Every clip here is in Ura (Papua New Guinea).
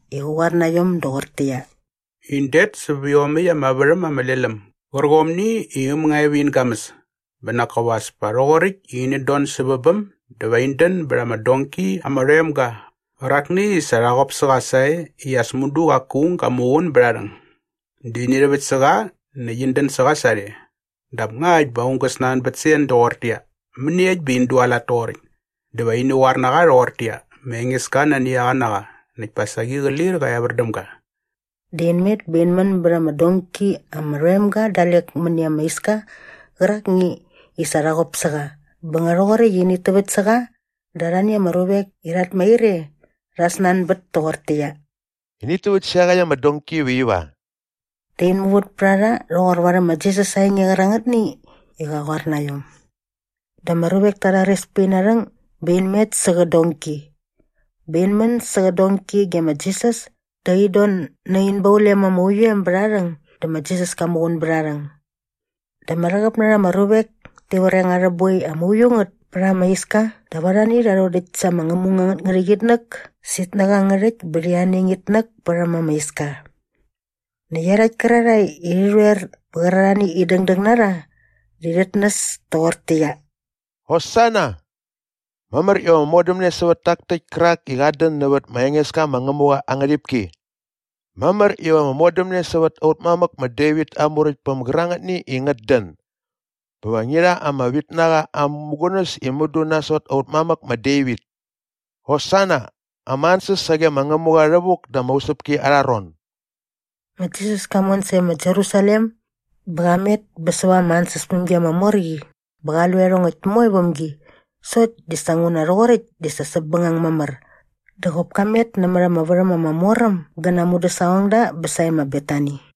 i qä qoar na iom doqortäqyia, “In det säp iomäkt ama värhäm ama lel äm gärqomni i äm nga e vä in gamäs bä nak kop as pa rhoqoräkt i inät don sävä bäm dä va in dän bät ama donki ama rhoem ga qärakni i sa rha qop sä qa sae i as mudu qaku aung ga muqun bät aa rhäng. Dä ini rhäväkt sä qa näkt in dän sä qa sarhe. Dap ngakt bä aung gä snanbät sä en doqortäqyia, ‘Mäniekt bä in dualat toqoräkt?’ dä va ini qoar na qa rhoqortäqyia, ‘Ma Engeska nani a qa na qa näkt pa saqi qä lir qä evär däm ga.’” Dä in met bä in män bät ama donki ama rhoem ga dalek mäni ama iska qärakni i sa rha qop sä qa bä nga rhoqoräkt i init täväkt sä qa dä arhani ama ruvek i rhat mair e rha snanbät toqortäqyia, “Init täväkt sä iaqäkt ama donki iva iva?” Dä in muvät pät a rha rhoqor varhäm ma Jisas aa enge qärangätni i qa qoar na iom. Dä ama ruvek ta rhares pät ina rhäng bä in met sä qä donki. Bä in män sä qä donki ge ma Jisas dä in don nä in baulem ama uiu em bät aa rhäng dä ma Jisas ka muqun bät aa rhäng. Dä ama rhäqäp na rha ama ruvek ti vreng arhä boi ama uiu ngät pät ama iska dap arhani rha rhodäkt sa ama ngämung angät ngärhäqyitnäk sä itnäk angä rhäkt bä rhi aneng itnäk pät ama iska. Näkt iarhakt kärarhae i rhi rhoer bä qärarhani i dängdäng na rha di rhit näs toqortäqyia, “Hosana!” “Mamär iva ama modämne sävät tak täkt kärak i qat dän nävät ma Engeska ma Ngämuqa aa ngärhipki!” “Mamär iva ama modämne sävät aut mamäk ma Devit aa muräktpäm gärangätni i ngät dän! Bä va ngi rha ama vitnaqa aa mämugunäs i mudu nasot aut mamäk ma Devit!” “Hosana, ama ansäs sage ma Ngämuqa rhävuk da ama usäpki arha ron!” Ma Jisas ka mon sae ma Jerusalem bä qa met bä säva ama ansäspämgi ama mor qi bä qa lu iarhongäkt moe väm gi sokt di sa nguna rhoqoräkt di sa säpbängang mamär dä qop ka met nämät ama värhäm ama mor äm gä na aa mudäsaqongda bä sae ma Betani.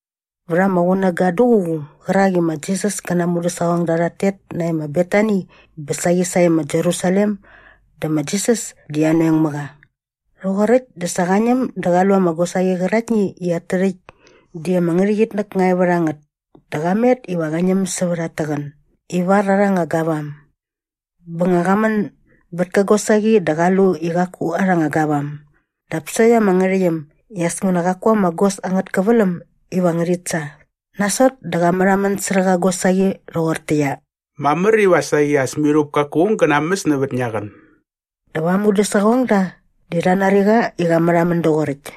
Vät ama qunäga duququ qärak i ma Jisas kä na aa mudäsaqongda rhat tet nae ma Betani bä saqi sae ma Jerusalem dä ma Jisas di anoeng mä qa. Rhoqoräkt dä sa qa ñäm dä qa lu ama gosaqi qäraktni i at tärhäkt di ama ngärhäqyitnäk nga e vät a ngät dä qa met iva qä ñäm sävät at täqän ivar arha anga gavam. Bä nga qa män bät kä gosaqi dä qa lu i qaku arha anga gavam dap sokt ama ngärhäqyäm i as nguna qaku ama gos angät käväläm iva ngärhit sa. Nasot dä qa märhamän särhä qä gosaqi rhoqortäqyia, “Mamär iva saqi as mirhup kaku aung gä namäs nävät ngia qän.” Dap aa mudäsaqongda di rha nari qa i qa märhamän doqoräkt.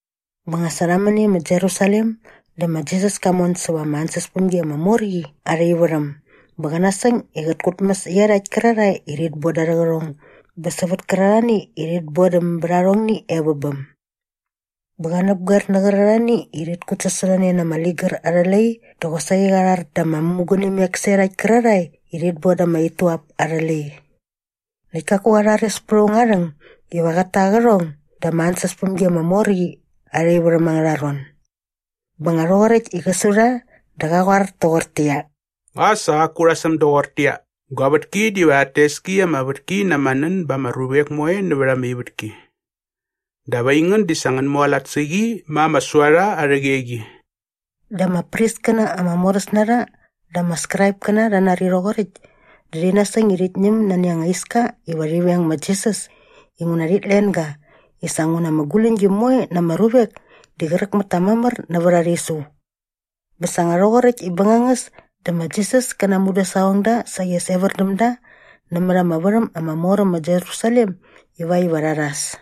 Bä sa nga rha män e ma Jerusalem dä ma Jisas ka mon säva ama ansäspämgi ama mor qi arha ivärhäm bä qa nasäng i qät kutmäs iarhakt kärarhae i rhit boda arhä qärhong bä sävät kärarhani i rhit bodäm bät arhongni e vä bäm. Bä qa näpgoer nä qärarhani i rhit kutsasorhane na ama ligär arhä lai dä qosaqi qa rhar da ama mämugunimek sä iarhakt kärarhae i rhit boda ama ituap arhä lai. Näkt kaku qa rhares pät aung aa rhäng iva qät ta aa qärhong da ama ansäspämgi ama mor qi arha ivärhäm angärha ron. Bä nga rhoqoräkt i qä su rha dä qa qoar toqortäqyia, “Nga sa qaku rha säm doqortäqyia, ‘Gua vätki diva rhat tes ki i ama vätki na ama nän ba ama ruvek moe nävät ama ivätki?’ Dap aingän di sa ngän mualat sä qi ma ‘ama suarha arhä qeqi.’” Dä ama priskäna ama moräs na rha dä ama Skraipkäna rha nari rhoqoräkt dä rhi nasäng i rhit ñäm nani anga iska iva rhi veng ma Jisas inguna rhit len ga i sa nguna ama guläñgi moe na ama ruvek di qräk mät ta mamär nävät aa rhisu. Bä sa nga rhoqoräkt i bängangäs dä ma Jisas kä na aa mudäsaqongda saqi as evär däm da nämät ama värhäm ama mor äm ma Jerusalem ivakt iva rha rhas.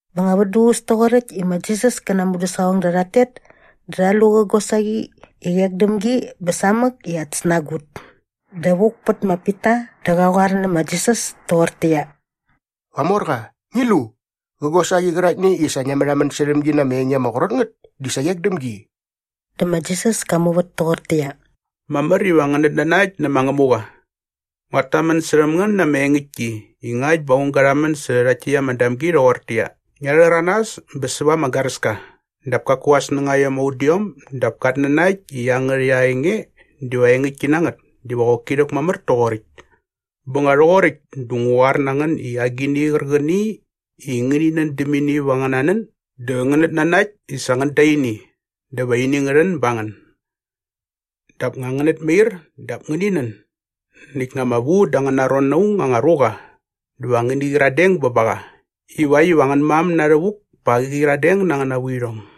Bä nga vät duququs toqoräkt i ma Jisas kä na aa mudäsaqongda rhat tet dä rha lu qä gosaqi i qek däm gi bä samäk i at snagut. Dä vuk pät ma Pita dä qa qoar nä ma Jisas toqortäqyia, “Qamorqa, ngi lu! Qä gosaqi qäraktni i sa ngia märhamän särhäm gi na ama enge ama qrot ngät di sa qek däm gi!” Dä ma Jisas ka muvät toqortäqyia, “Mamär iva ngänät nanakt nä ma Ngämuqa.” “Nguat tamän särhäm ngän na ama engäktki i ngakt bä aung ga rhamän särhä rhakt täkt ama damgi rhoqortäqyia, ‘Ngia rhäranas bä säva ama garäska’ dap kaku aa snängaiom ama udiom dap kat nanakt i iangärhäkt aa enge diva engäktki na ngät diva qoki rhäkmamär toqoräkt. Bä nga rhoqoräkt dä ngu qoar na ngän i agini qärqäni i ngäni nän däm ini vät angäna nän dä ngänät nanakt i sa ngän da ini dä va ini ngä rhän ba ngän. “Dap nga ngänät mair dap ngäni nän näkt nga ama vu dä angäna ron na aung anga ruqa dä va ngäni qyiradeng bä ba qa ivakt iva angän mam na rhävuk pa qä qyiradeng na angäna vuirhong.”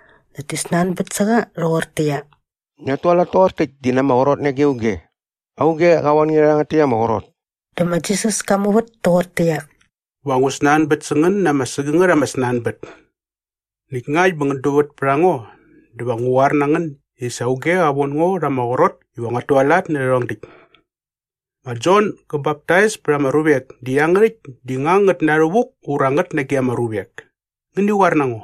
Näkt ti snanbät sä qa rhoqortäqyia, “Ngiat tualat toqor täkt di na ama qrot nage auge? Auge qa von nge rhä rhangät täkt ama qrot?” Dä ma Jisas ka muvät toqortäqyia, “Va ngu snanbät sä ngän na ama sägängät ama snanbät. Näkt ngakt bä ngän duvät pät a ngo dä va ngu qoar na ngän i sa auge qa von ngo rha ama qrot iva nguat tualat nä rhärhong däkt. Ma Jon gä baptais pät ama ruvek di iangärhäkt di nga ngät na rhävuk ura ngät nage ama ruvek? Ngäni qoar na ngo.”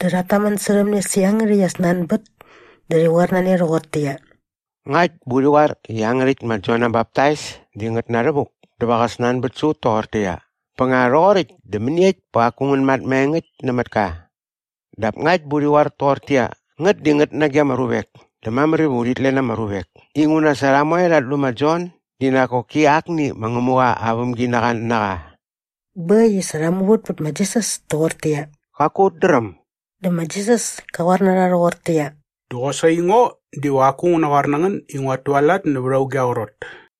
Dä rhat tamän särhäm ne sä iangärhäkt aa snanbät dä rhi qoar na ne rhoqortäqyia, “Ngakt bä urhi qoar i iangärhäkt ma Jon aa baptais di ngät na rhävuk dä va qä snanbät sä ut toqortäqyia, ‘Bä nga rhoqoräkt dä mäniekt bä qaku ngän mat maengäkt nämät ka?’ Dap ngakt bä urhi qoar toqortäqyia, ‘ngät di ngät nage ama ruvek’ dä mamär iva urhit len ama ruvek inguna sa rha moe rhat lu ma Jon di nak koki akni ma Ngämuqa aa vämginaqa na qa.” Bä äkt i sa rha muvät pät ma Jisas toqortäqyia, “Qaku ut dräm.” Dä ma Jisas ka qoar na rha rhoqortäqyia, “Dä qosaqi ngo diva qaku ngu naqoar na ngän i nguat tualat nävät auge aa qrot.”